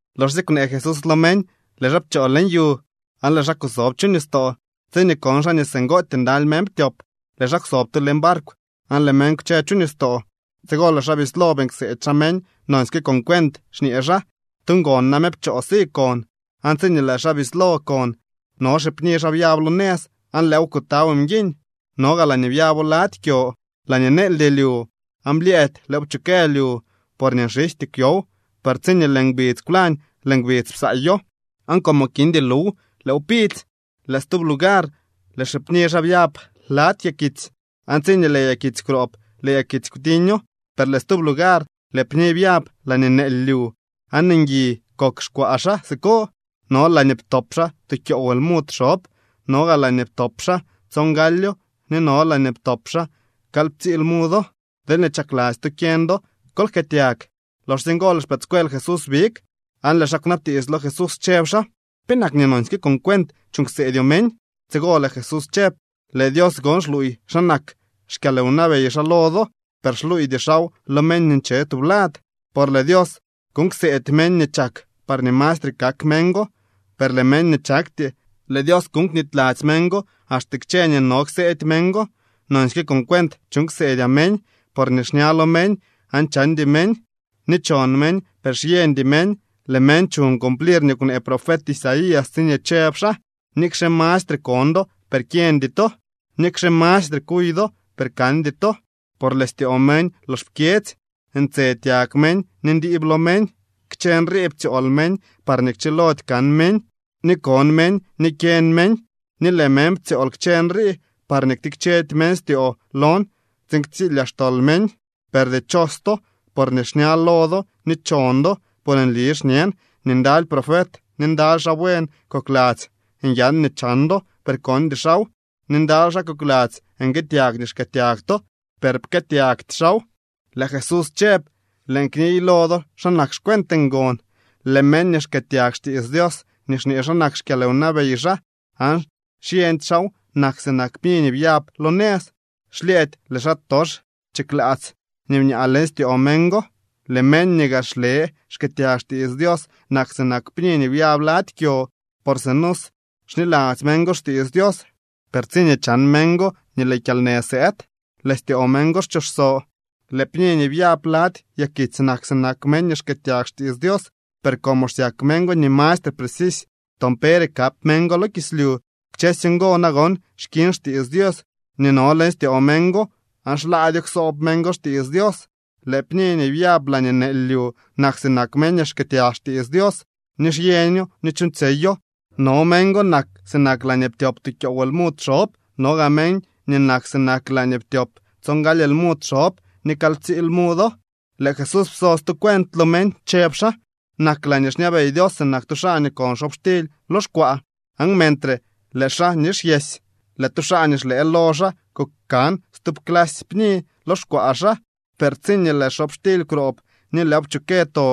Loxsye kwnee Jesús lo meñ, lëë xaa pchoo leñ yu aan lëë xaa kusob chu nistoo. Tsiñee kon xaa nii singootyee ndaly meñ ptyop, lëë xaa kwsob tu leñ barkw aan lëë meñ kwche chu nistoo. Tsigo lëë xaa bislo beeñ kseedy xaa meñ nonsyke con cuent, xñee xaa: —Tu ngon name pchoo si kon. Aan tsiñee lëë xaa bislo kon, no xipni xaa byab lo nëz, aan lëëw kutaw mguiñ. No gaa laañee byabo lady kyo laañee neeldy lyu, aan blyëëdy lëëw pchukë lyu, porñee nxijty kwyow. Per tsiñee lëë ngbidz kwlañ lëë ngbidz psaayo, aan como kindy luw lëëw pidzy. Lëë stub lugar lëë xipni xaa byab lady yakitsy, aan tsiñee lëë yakitsy kwroob lëë yakitsy kwtiño. Per lëë stub lugar lëë pni byab laañee neely lyu, aan ngui kok xkwaa xaa siko. No laañee ptop xaa tu kyoow lmud xob, no gaa laañee ptop xaa tsongalyo ni no laañee ptop xaa kalyptsii lmudo. Deelñee chakladzy to kyeñ do, ¡kol jkëëtyag! Loxsye ngo lëë xpëëdscuel Jesús big, aan lëë xaa kwnabtiits lo Jesús, chëb xaa: —¿Penak nii nonsyke con cuent chuuñ kseedyoo meñ? Tsigo lëë Jesús chëb: —Lëë Dios gon xluuy xa nak xkyalwnabey xaa lo do, per xluuydy xaaw lo meñ nii nche tublad. Por lëë Dios kuuñ kseedy meñ nii chak parñee mastre kak meñ go, per lëë meñ nii chakty, lëë Dios kuñ nii knityladzy meñ go axte kchë nii no kseedy meñ go. Nonsyke con cuent chuuñ ksedyaa meñ, porñee xña lo meñ aan chandy meñ, ni chon meñ per xyeñdy meñ. Lëë meñ chuñ cumplir nii kwnee profet Isaías tsiñee chëb xaa: Nikxe mastre kon do, per kyeñdy to, nikxe mastre kuy do, per kandy to. Por lëë styoo meñ lox pkyedzy. Ntse tyag meñ, ni ndiib lo meñ. Kchë nrii ptsyool meñ parñee kchilody kan meñ, ni kon meñ ni kyeñ meñ. Ni lëë meñ ptsyool kchë nrii parñee ktikchedy meñ styoo lon tsiin ktsilyaa xtol meñ. ’Per dichos to, porñee xña lo do ni chon do. Por nli xñen nii ndaly profet ni ndaly xaa buen kokladzy nyan nii chan do, per kondy xaaw, ni ndaly xaa kokladzy nguëëtyag nii xkëëtyag to, per pkëëtyagty xaaw. Lëë Jesús chëb: —Lëën kniy lo do xa nak xcuent ngon. Lëë meñ nii xkëëtyag xtiits Dios nii xñee xa nak xkyalwnabey xaa aan xyeñdy xaaw nak sinak pni nii byab lo nëz. Xlyëëdy lëë xaatox chiklaats nii bñaa leñ styoo meñ go. Lëë meñ nii gaa xle xkëëtyag xtiits Dios nak sinak pni nii byab lady kyo. Por sinusy xniladzy meñ go xtiits Dios, per tsiñee chan meñ go nii lëë kyalnë sëëd, lëë styoo meñ go xchoso. Lëë pni nii byab lady yakitsy nak sinak meñ nii xkëëtyag xtiits Dios, per como xsyak meñ go nii mastre precisy toon pere kap meñ go lo kislyu, kchësy ngo nagon xkiñ xtiits Dios nii no leñ styoo meñ go aan xlaadyoo ksoob meñ go xtiits Dios. Lëë pni nii byab laañee neely lyu nak sinak meñ nii xkëëtyag xtiits Dios, ni xyeño, ni chuuñtsyeyo. No meñ go nak sinak laañee ptyop tu kyoow lmud xob, no gaa meñ nii nak sinak laañee ptyop tsongaly lmud xob, ni kalyptsii lmudo. Lëë Jesús pso stu cuent lo meñ, chëb xaa: —Nak laañee xñabey Dios sinak tu xaa nii kon xobxtily lo xkwaa. Aan mentre lëë xaa nixyesy, lëë tu xaa nii xlëë lo xaa kukan stub clasy pni lo xkwaa xaa. Per tsiñee lëë xobxtily kwroob, ni lëëw pchukë to,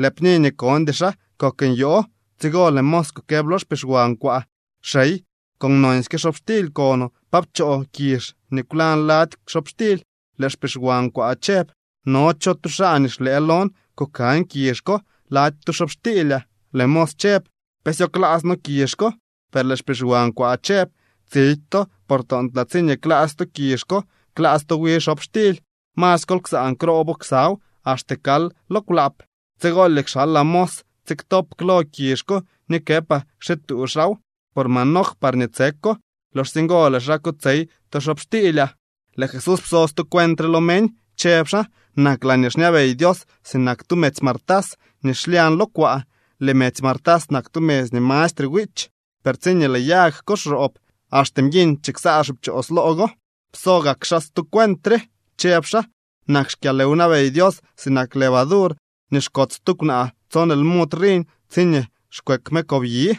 lëë pni nii kondy xaa kok nyoo. Tsigo lëë mos kukëb lo xpixwan kwaa: “Xey, con nonsy xobxtily konoo, ¿pa pchoo kizh nii kwlañ lady xobxtily?” Lëë xpixwan kwaa chëb: “No cho tu xaa nii xlëë lon kukan kizh ko lady tu xobxtiilyaa.” Lëë mos chëb: “¿Pe syo klaats noo kizh ko?” Per lëë xpixwan kwaa chëb: “Tsidy to, por toontlaa tsiñee klaats to kizh ko, klaats to wi xobxtily. Masy kol ksaan kroobo ksaw axte kal lo kwlaap. Tsigolye kxalaa mos tsiktop klo kizh ko ni këpaa kxituu xaaw por manoj parñee tseko. Loxsye ngo lëë xaa kotsey tu xobxtiilyaa.” Lëë Jesús pso stu cuent re lo meñ, chëb xaa: —Nak laañee xñabey Dios sinak tu medzy martas nii xlyañ lo kwaa. Lëë medzy martas nak tu medzy nii mastre wiich. Per tsiñee lëë yag ko xroob, axte mguiñ chiksaa xipchoos loo go. Pso gak xaa stu cuent re, chëb xaa: —Nak xkyalwnabey Dios sinak levadur nii xkots tu kwnaa tson lmud riñ tsiñee xkweek me kobyi.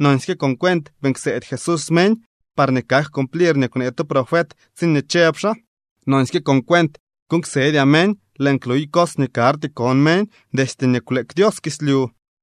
Nonsyke con cuent beeñ kseedy Jesús meñ parñee kak cumplir nii kwnee tu profet tsiñee chëb xaa: Nonsyke con cuent kuuñ ksedyaa meñ. Lëën kluy cos nii karty kon meñ destye nii kwleek Dios kislyu.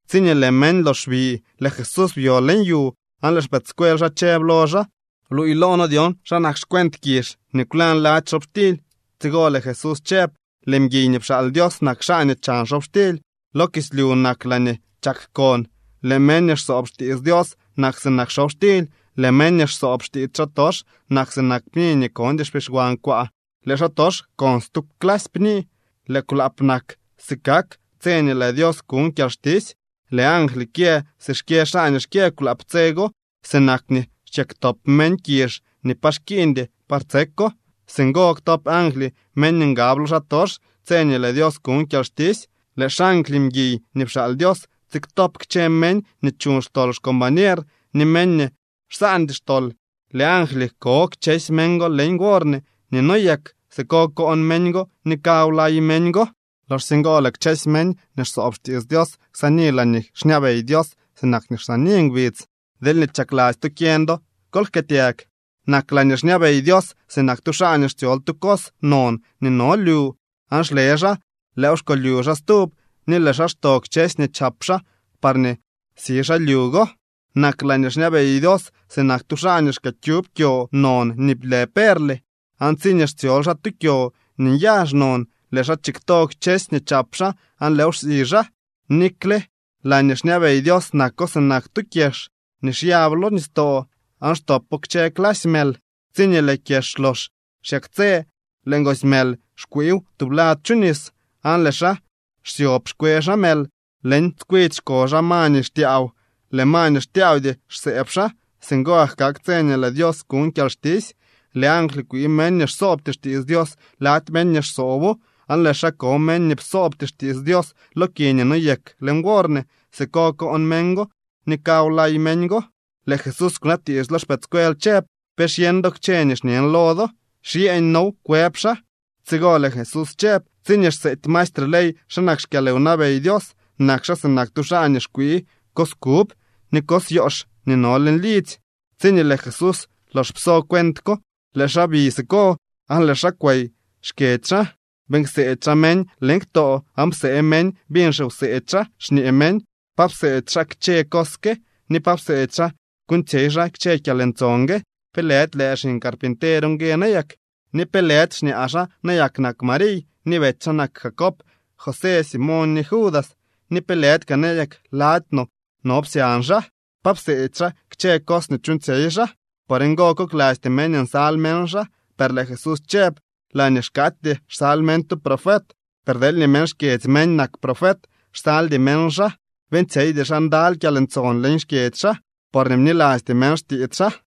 Tsiñee lëë meñ lox bi, lëë Jesús byo leñ yu, aan lëë xpëëdscuel xaa chëb lo xaa: —Bluuy loo noo dyon xa nak xcuent kizh nii kwlañ lady xobxtily. Tsigo lëë Jesús chëb: —Lëë mguiy nii pxaal Dios nak xaa nii chan xobxtily. Lo kislyu nak laañee chak kon. Lëë meñ nii xsoob xtiits Dios nak sinak xobxtily. Lëë meñ nii xsoob xtiits xaatox nak sinak pni nii kondy xpixwan kwaa. Lëë xaatox kon stub clasy pni. Lëë kwlaap nak si kak tse nii lëë Dios kuñ kyalxtisy. Lëë angly kyë si xkyë xaa nii xkyë kwlaap tse go. Sinak nii xkyëktop meñ kizh nii pa xkiiñdy par tseko, singo ktop angly meñ nii ngab lo xaatox tse nii lëë Dios kuñ kyalxtisy. Lëë xangly mguiy nii pxaal Dios tsiktop kchë meñ nii chuñ xtol xcombañer, ni meñ nii xsaandy xtol. Lëë angly ko kchësy meñ go leñ worne nii noyek. Siko koon meñ go ni kawlay meñ go. Loxsye ngo lëë kchësy meñ nii xsoob xtiits Dios ksaani laañee xñabey Dios sinak nii xsaani ngbidz. Deelñee chakladzy to kyeñ do, ¡kol jkëëtyag! ’Nak laañee xñabey Dios sinak tu xaa nii xtsyol tu cos non nii no lyu. Aan xle xaa, lëëw xkolyu xaa stub, ni lëë xaa xto kchësy nii chap xaa parñee si xaa lyu go. ’Nak laañee xñabey Dios sinak tu xaa nii xkyëkyub kyo non nii lë perle. Aan tsiñee xtsyol xaa tu kyo nii nyazh non, lëë xaa chikto kchësy nii chap xaa aan lëëw xsi xaa. ’Nikle laañee xñabey Dios nako sinak tu kyex nii xyab lo nistoo aan xtopo kchë clasy mël. Tsiñee lëë kyex lox xyaktsë, lëë ngoosy mël xkwiiw tublad chu nis, aan lëë xaa xsyob xkwe xaa mël. Leñ tskwidy xko xaa ma nii xtyaaw. Lëë ma nii xtyaawdy xsëëb xaa. Singo gak kak tse nii lëë Dios kuñ kyalxtisy. Lëë angly kwii meñ nii xsoobty xtiits Dios lady meñ nii xsoobo, aan lëë xaa ko meñ nii psoobty xtiits Dios lo ki nii noyek leñ worne. Siko koon meñ go ni kawlay meñ go. Lëë Jesús kwnabtiits lo xpëëdscuel chëb: —¿Pe xyeñ do kchë nii xñen lo do? —Xyeeñ noow —kwëb xaa. Tsigo lëë Jesús chëb: —Tsiñee xseedy maestre ley xa nak xkyalwnabey Dios, nak xaa sinak tu xaa nii xkwii cos kub ni cos yoox nii no leñ lidzy. Tsiñee lëë Jesús lox pso kchë cuent ko, lëë xaa bi siko, aan lëë xaa kwey xkyedzy xaa. Beeñ kseedy xaa meñ leñ ktoo aan psee meñ biñ xiwseedy xaa, xñee meñ: —¿Pa pseedy xaa kchë cos ke ni pa pseedy xaa kuuñtsyey xaa kchë kyalntson gue? ¿Pe lëdy lëë xiñ carpinter ngue nayak? ¿Ni pe lëdy xñaa xaa nayak nak Mariy, ni betsy xaa nak Jacob, José, Simoñ ni Judas? ¿Ni pe lëdy kaa nayak lady no no psyañ xaa? ¿Pa pseedy xaa kchë cos nii chuuñtsyey xaa? Por ngo koklasty meñ nsal meñ xaa. Per lëë Jesús chëb: —Laañee xkaatyee xsal meñ tu profet, per deelñee meñ xkyedzy meñ nak profet, xsaldy meñ xaa. Beeñtsyeydy xaa ndaly kyalntson leñ xkyedzy xaa, porñee bnilasty meñ xtiits xaa.